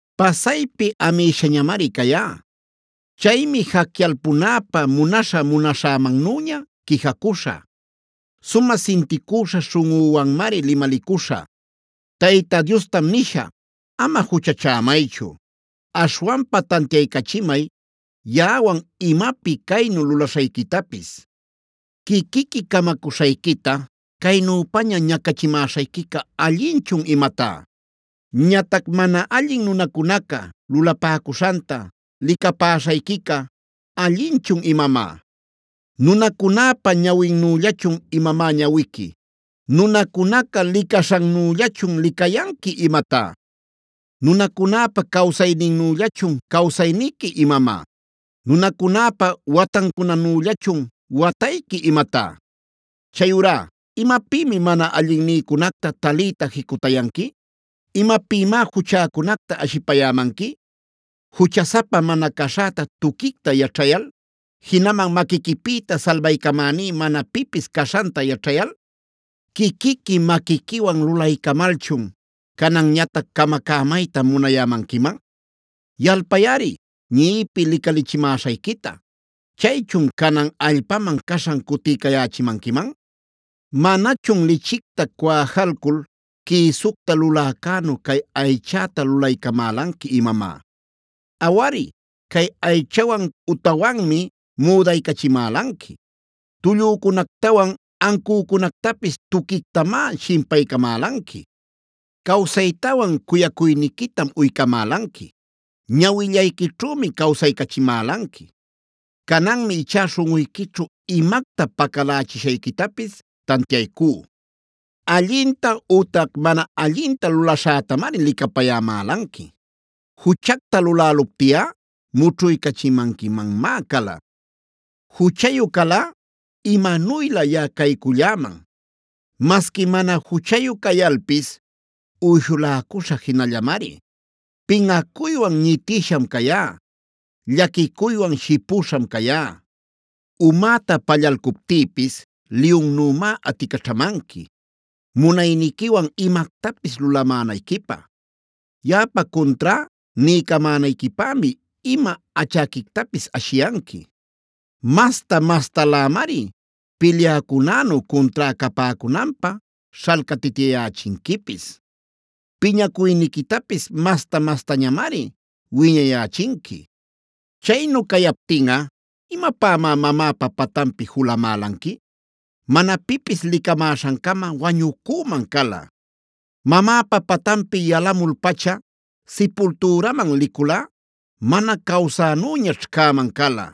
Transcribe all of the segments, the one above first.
“Pasaypi amïshañamari cayá. Chaymi jacyalpunäpä munaśhä-munaśhämannüña quijacuśhä. Sumä sinticüśha śhunꞌüwanmari limalicuśhä. Tayta Diostam nishä: Ama juchachämaychu. Aśhwanpa tantiaycachimay yaꞌawan imapi caynu lulaśhayquitapis. Quiquiqui camacuśhayquita ¿caynüpaña ñacachimäśhayquica allinchun imatá? Ñatac ¿mana allin nunacunaca lulapäcuśhanta, licapäśhayquicá allinchun imamá? ¿Nunacunäpa ñawinnüllachun imamá ñawiqui? ¿Nunacunaca licaśhannüllachun licayanqui imatá? ¿Nunacunäpa cawsayninnüllachun cawsayniqui imamá? ¿Nunacunäpa watancunanüllachun watayqui imatá? Chayurá ¿imapïmi mana allinnïcunacta taliyta jicutayanqui? ¿Imapïmá juchäcunacta ashipayämanqui, juchasapa mana caśhäta tuquicta yaćhayal, jinaman maquiquipïta salbaycamäní mana pipis caśhanta yaćhayal? Quiquiqui maquiquiwan lulaycamalchun, ¿cananñatac camacämayta munayämanquiman? Yalpayꞌari ñiꞌipi licalichimäśhayquita. Chaychun, ¿canan allpaman caśhan cutiycayächimanquiman? ¿Manachun lichicta cuwajalcul quïsucta luläcänu cay aychäta lulaycamälanqui imamá? Awari, cay aychawan utawanmi müdaycachimälanqui. Tullücunactawan ancücunactapis tuquictamá shimpaycamälanqui. Cawsaytawan cuyacuyniquitam uycamälanqui. Ñawillayquićhümi cawsaycachimälanqui. Cananmi ichá śhunꞌuyquićhu imacta pacalächishayquitapis tantiaycú: Allinta ütac mana allinta lulaśhätamari licapayämälanqui. Juchacta luläluptiꞌa mućhuycachimanquimanmá cala. Juchayu calꞌa imanuylä yaꞌa cayculläman. Masqui mana juchayu cayalpis uyshuläcuśhä jinallamari. Pinꞌacuywan ñitïsham cayá; llaquicuywan shipüśham cayá. Umäta pallalcuptïpis liyunnümá aticaćhamanqui, munayniquiwan imactapis lulamänayquipä. Yaꞌapa cuntrá niycamänayquipämi ima achäquictapis ashiyanqui. Masta-mastalämari pilyäcunänu cuntrá capäcunanpä śhalcatityayächinquipis. Piñacuyniquitapis masta-mastañamari wiñayächinqui. “Chaynu cayaptinꞌa, ¿imapämá mamäpa patanpi julamälanqui? Mana pipis licamäśhancama wañucüman cala. Mamäpa patanpi yalämul-pacha sipultüraman liculꞌa, mana cawsänüñaćh cäman cala.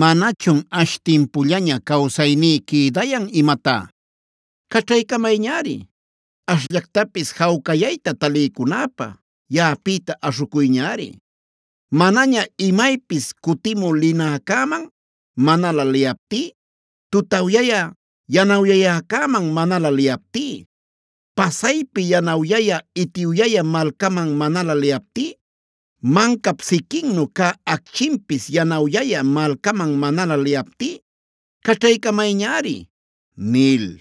¿Manachun ash timpullaña cawsayní quïdayan imatá? ¡Caćhaycamayñari! Ashllactapis jawcayayta taliycunäpä yaꞌapïta aśhucuyñari. Manaña imaypis cutimü linäcäman manalä liyaptí,a tutawyä yanawyayäcäman manalä liyaptí, pasaypi yanawyayä itiwyayä malcaman manalä liyaptí, mancap siquinnu cä acchinpis yanawyayä malcaman manalä liyaptí, caćhaycamayñari” nil.